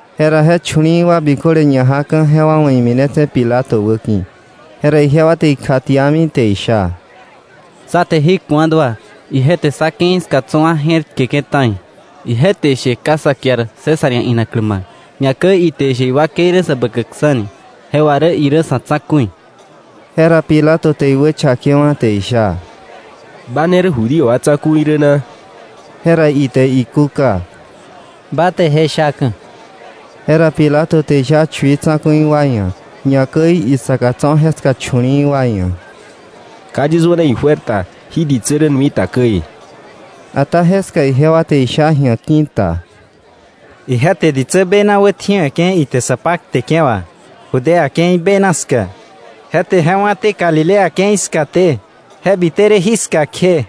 Jera je chu̱li̱i̱ wa biköle ñajaka̱, jewa wa̱ iminetse̱ Pilato wäki̱. Jera ijewa te ikjatiami te isha: “Sá te jí ku̱a dua. Ije te sá ke̱i ska tso̱ wa je̱r tkeke̱ ta̱i, ije te ishe ka sa kiar César ia̱ inaklä ma̱k, ñakäi ite ishe iwakei rä Säbäkäkksa̱ ni, je wà rä irä sa̱ tsa̱ku̱i.” Jera Pilato te iwächakewa̱ te isha: —¿Ba ne rä Judío wa Tsa̱ku̱i rä na? Jera ite ikúka: —Ba te je shaka̱. Jera Pilato te isha chui tsa̱ku̱i wa ia̱, ñakäi isaka tso̱ jeska chu̱li̱i̱ wa ia̱: —Ka yis wäna ijuer ta jí ditsä rä nui ta käi. Ata jeska ijewa te isha ji̱a ki̱ta: —Ije te ditsä bena wätjiwe̱ke̱ ite sa pakteke̱ wà Judea ke̱i bena ska. Je te je wá̱té Galilea ke̱i skaté, je bite rä jiska kje.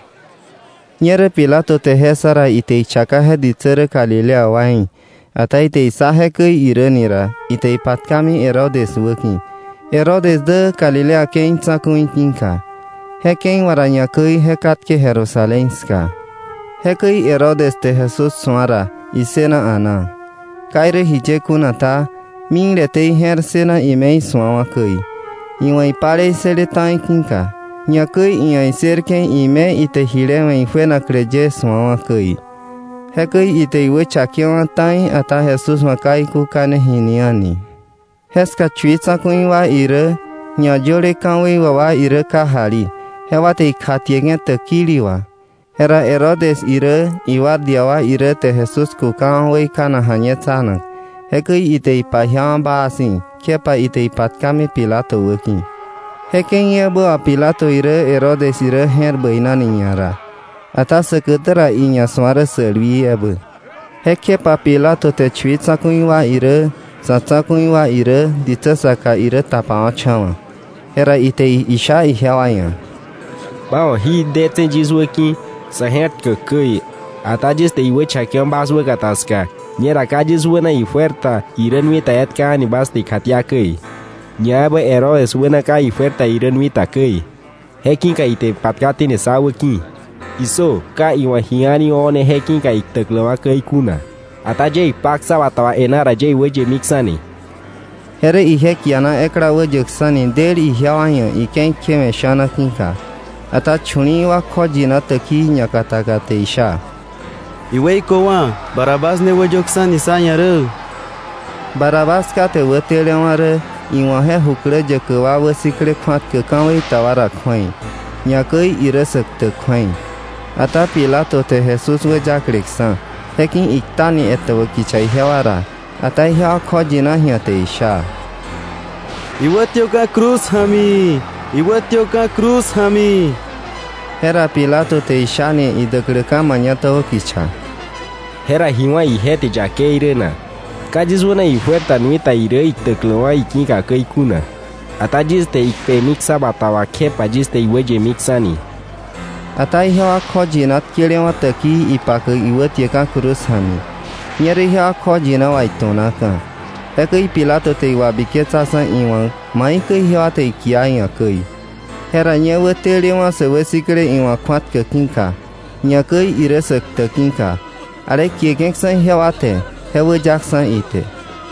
Ñerä Pilato te je ssa ra, ite chaka je ditsä rä galilea waí̱. Ata ite issa jekäi irä ni ra, ite ipatkami Herodes wäki̱, Herodes dä Galilea ke̱i tsa̱ku̱i ki̱ka. Je ke̱i wà ra ñakäi je katke Jerusalén ska. Jekäi Herodes te Jesús su̱a ra, issëna a̱naa. Ka irä jiye kuna ta, mikleté ije̱r ssëna ime isu̱awa̱ käi, iwa̱ ije palei ssële ta̱i ki̱ka, ñakäi iia̱ issërke̱ ime ite jile we̱ ijuenaklä ye su̱awa̱ käi. Jekäi ite iwächakewa̱ ta̱i, ata Jesús wa̱ ka ikúkane jini a̱ni. Jeska chui tsa̱ku̱i wa irä, ñayöle ka̱wei wà wa irä kajali; jewa te ikjatieke̱ täkili wà. Jera Herodes irä iguardia wa irä te Jesús kukawa̱ weikanak ja̱ñetsanak, jekäi ite ipajiawa̱ baa si̱, kjepa ite ipatkamini Pilato wäki̱. Je ke̱i ebä wà Pilato irä Herodes irä je̱r bäinani ñara, ata säkätä ra iña su̱a rä sälwii ebä. Jekjepa Pilato te chui tsa̱ku̱i wa irä, sa̱ tsa̱ku̱i wa irä, ditsä saka irä tapawa̱cha̱wa̱. Jera ite isha ijewa ia̱: —Bas wa̱ jí detse̱ yis wä ki̱ sa̱ je̱r tkäk käi; ata yis te iwächakewa̱ bas wäkata ska. Ñera ka yis wäna ijuer ta irä nui ta etka a̱ni bas te ikjatia käi. Ñaebä Herodes wäna ka ijuer ta irä nui ta käi, je ki̱ka ite ipatkaténi sá wäki̱. ¡Issö! Ka iwa̱ ji a̱ni o̱ne je ki̱ka iktäkläwa̱ käi kuna. Ata yie ikpa ksa bata wà e̱ná ra yis te iyemiksa̱ni. Je rä ije kiana ekla wäyäkksa̱ni del ijewa ia̱ ike̱i kjewe̱ sha̱na ki̱ka. Ata chu̱li̱i̱ wa kjoyina täkii ñakataka te isha: —¡Iweiköwa̱! ¡Barrabás ne wäyöksa̱ni sá ia̱ rä! Barrabás kate wätelewa̱ rä iwa̱ je jukläyäkä wa wäsikle kju̱atkäk ka̱wei ta wa ra kju̱ei, ñakäi irä sä ktäk kju̱ei. Ata Pilato te Jesús wäyakleksa̱, je ki̱ iktani etäbä kicha ijewa ra, ata ijewa kjoyina ji̱a te isha: —¡Iwätiöka̱ cruz ja̱mi! ¡Iwätiöka̱ cruz ja̱mi! Jera Pilato te ishani idäkläka̱ mañatäbä kicha: —¿Jera ji wá̱ ije te yakei rä na? Ka yis wäna ijuer ta nui ta irä, iktäkläwa̱ iki̱ka käi kuna. Ata yis te ikpemi ksa bata wà kjepa yis te iwäyemiksa̱ni. Ata ijewa kjoyina tkelewa̱ täkii ipakäk iwätiäkka̱ cruz ja̱mi. Ñerä ijewa kjoyina wà itu̱naka̱. Jekäi Pilato te iwabiketsaksa̱ iwa̱k maikäi ijewa te ikia iia̱ käi. Jera ñe wätelewa̱ sä wäsikle iwa̱ kju̱atkäk ki̱ka, ñakäi irä sä ktäk ki̱ka, ale kieke̱ksa̱ ijewa te, je wäyaksa̱ ite.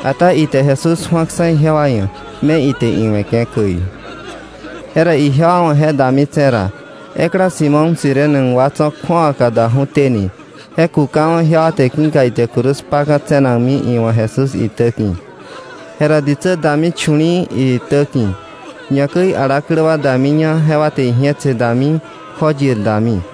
Ata ite Jesús ju̱aksa̱ ijewa ia̱ me ite iwe̱ käi. Jera ijewa wa̱ je dami tse̱ ra, ekla Simón Cirene wa tso̱ kju̱awaka daju̱téni, je kukawa̱ ijewa te ki̱ka ite cruz kpaka̱ tse̱nakmi iwa̱ Jesús itä ki̱. Jera ditsä dami chu̱li̱i̱ iitä ki̱, ñakäi alaklä wa damiña jewa te iji̱etse dami, kjoyir dami.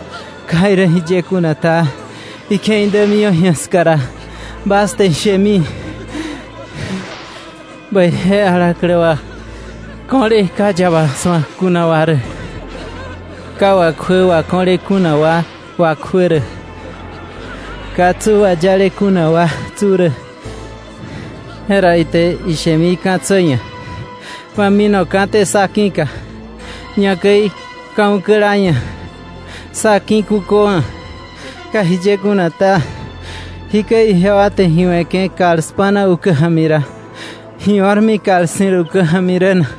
Ka irä jiye kuna ta, ike̱i dämiwa̱ ska ra bas te ishemi: “Bäije alaklä wa ko̱le ka yaba su̱ak kuna wa rä, ka wakjuä wako̱le kuna wa wakjuä rä, ka tsu wayale kuna wa tsu rä.” Je ra ite ishemi ka̱tsä ia̱: ‘¡Ma minoté sá ki̱ka!’, ñakäi ka̱ ukäla ia̱: ‘¡Sá ki̱ kuköwa̱!’ Ka irä jiye kuna ta, jí käi ijewa te ji we̱ke̱ kal spa̱na ukä ja̱mi ra, ¿ ji o̱rmi kal ssi̱l ukä ja̱mi rä na?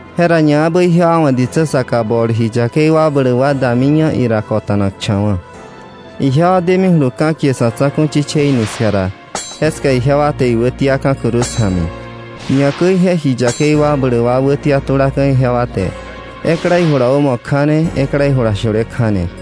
Jera ñaebä ijewa wa̱ ditsä saka bol ji yakei wakbläk wa damiña ira kota̱nakcha̱wa̱. Ijewa demijulu ka̱ kie “Sa̱tsa̱ku̱ Chichei” ni ska ra, jeska ijewa te iwätiaka̱ cruz ja̱mi, ñakäi je ji yakei wakbläk wa wätia tulaka̱ ijewa te, ekla ijula wämo kja̱ne, ekla ijula shule kja̱ne.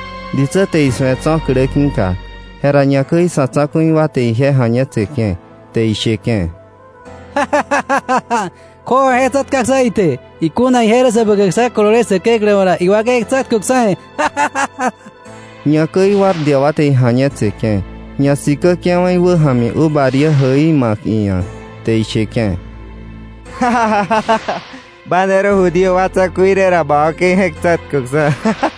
Ditsä te isu̱e tso̱ klä ki̱ka, jera ñakäi sa̱ tsa̱ku̱i wa te ije ja̱ñetseke̱, te isheke̱: —Kju̱awa je tsa̱tkaksa̱ ite; ikuna ije rä Säbäkäkksa̱ kolole Säkeklä wa̱ ra, iwakei je̱k tsa̱tköksa̱. Ñakäi guardia wa te ija̱ñetseke̱, ñasikäke̱wa̱ iwä ja̱mi uva diä jäi ma̱k iia̱, te isheke̱: —¡Ba ne rä Judío wa Tsa̱ku̱i rä ra, ba wakei je̱k tsa̱tköksa̱!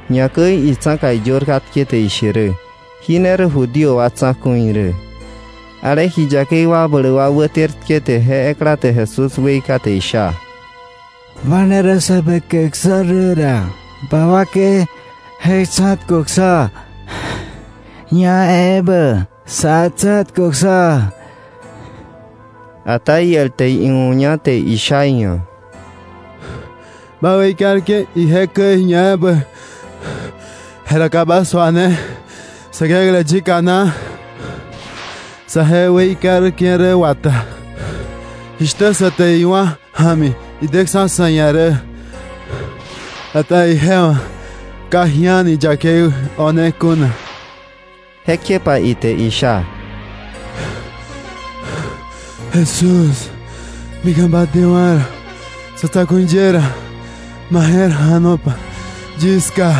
Ñakäi itsa̱ka iyör katke te ishe rä: “Jí ne rä Judío wa Tsa̱ku̱i rä.” Ale ji yakei wakbläk wa wäter tkete je ekla te Jesús weika te isha: —¡Ba ne rä Säbäkäkksa̱ rä ra, ba wakei je̱k tsa̱tköksa̱, ñaebä sá tsa̱tköksa̱! Ata iel te iuña te sha iia̱: —Ba weikarke̱ ije käi ñaebä; jera ¿ka ba suane Säkeklä yika na? Sa je weikarke̱ rä wata, jishtä sä te iwá̱ ja̱mi ideksa̱ sa̱ ia̱ rä. Ata ije wa̱ ka ji a̱ni yakei o̱ne kuna. Jekjepa ite isha: —Jesús, mika̱ bä dewa̱ Sa̱tsa̱ku̱i ye ra, ma je̱r ja̱nopa yis ska.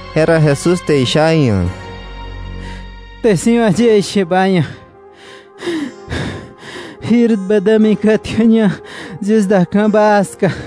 Jera Jesús te isha iia̱: —Kte si̱ wà yie ishe ba ia̱, jir bä dämika̱ kätkäña yis da ka̱ baa ska.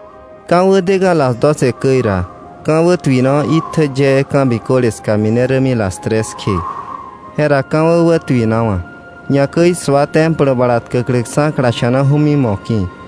Ka̱wä deka̱ las doce käi ra, ka̱ wätuinawa̱ itjä yee ka̱ biköle ska mine rämi las tres kje. Jera ka̱wä wätuinawa̱, ñakäi sua Templo bala tkäkläksa̱ klasha̱naju̱mi moki̱.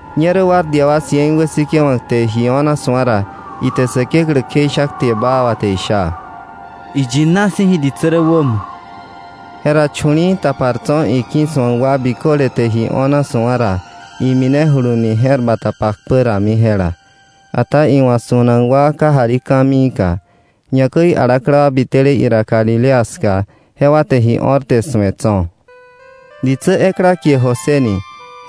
Ñerä guardia wa cien wäsikäk te ji o̱na su̱a ra, ite Säkeklä kjeisha kte baa wà te isha: —Iyina si̱ jí ditsä rä wämo. Jera chu̱li̱i̱ tapar tso̱ iki̱ su̱ak wa biköle te ji o̱na su̱a ra, iminejuluni je̱r bata pakpä rami jela. Ata iwa̱ su̱nak wa kajali ka̱miika, ñakäi alaklä wa biteleté ira Galilea ska jewa te ji o̱r te su̱e tso̱. Ditsä ekla kie José ni,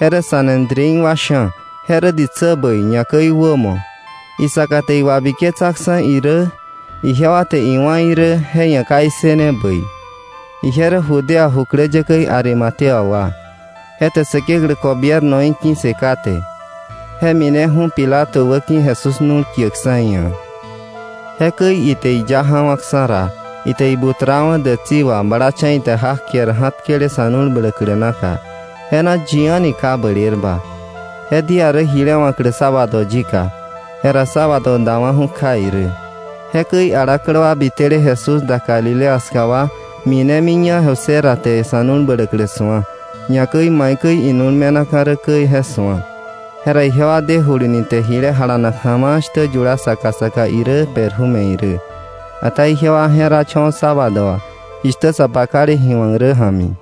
je rä Sanedrín wa sha̱, je rä ditsä bäi, ñakäi wämo. Isaka te iwabiketsaksa̱ irä, ijewa te iwa̱ irä, je ia̱ ka issëne bäi. Ije rä Judea jukläyäkäí Arimatea wa, je te Säkeklä gobiernoí ki̱ssë kate. Je mineju̱ Pilato wäki̱ Jesús nu̱l kiäkksa̱ iia̱. Jekäi ite iya ja̱wa̱ksa̱ ra, ite ibutrawa̱ dätsi wà, blacha̱ ite jak ker ja̱tkele sa̱ nu̱l bläklä naka, je na yi a̱ni ka blerba. Je día rä jile wa̱klä sábado yika, jera sábado dawa̱ju̱ kja irä. Jekäi alaklä wa bitele Jesús da Galilea ska wa minemiña José ra te sa̱ nu̱l bläklä su̱a, ñakäi maikäi inu̱l me̱naka̱ rä käi je su̱a. Jera ijewa dejuluni te ji jalanak ja̱ma̱a̱ shtä yula saka saka irä perfume irä. Ata ijewa je̱racha̱wa̱ sábado wà jishtä sa pakale ji wa̱k rä ja̱mi.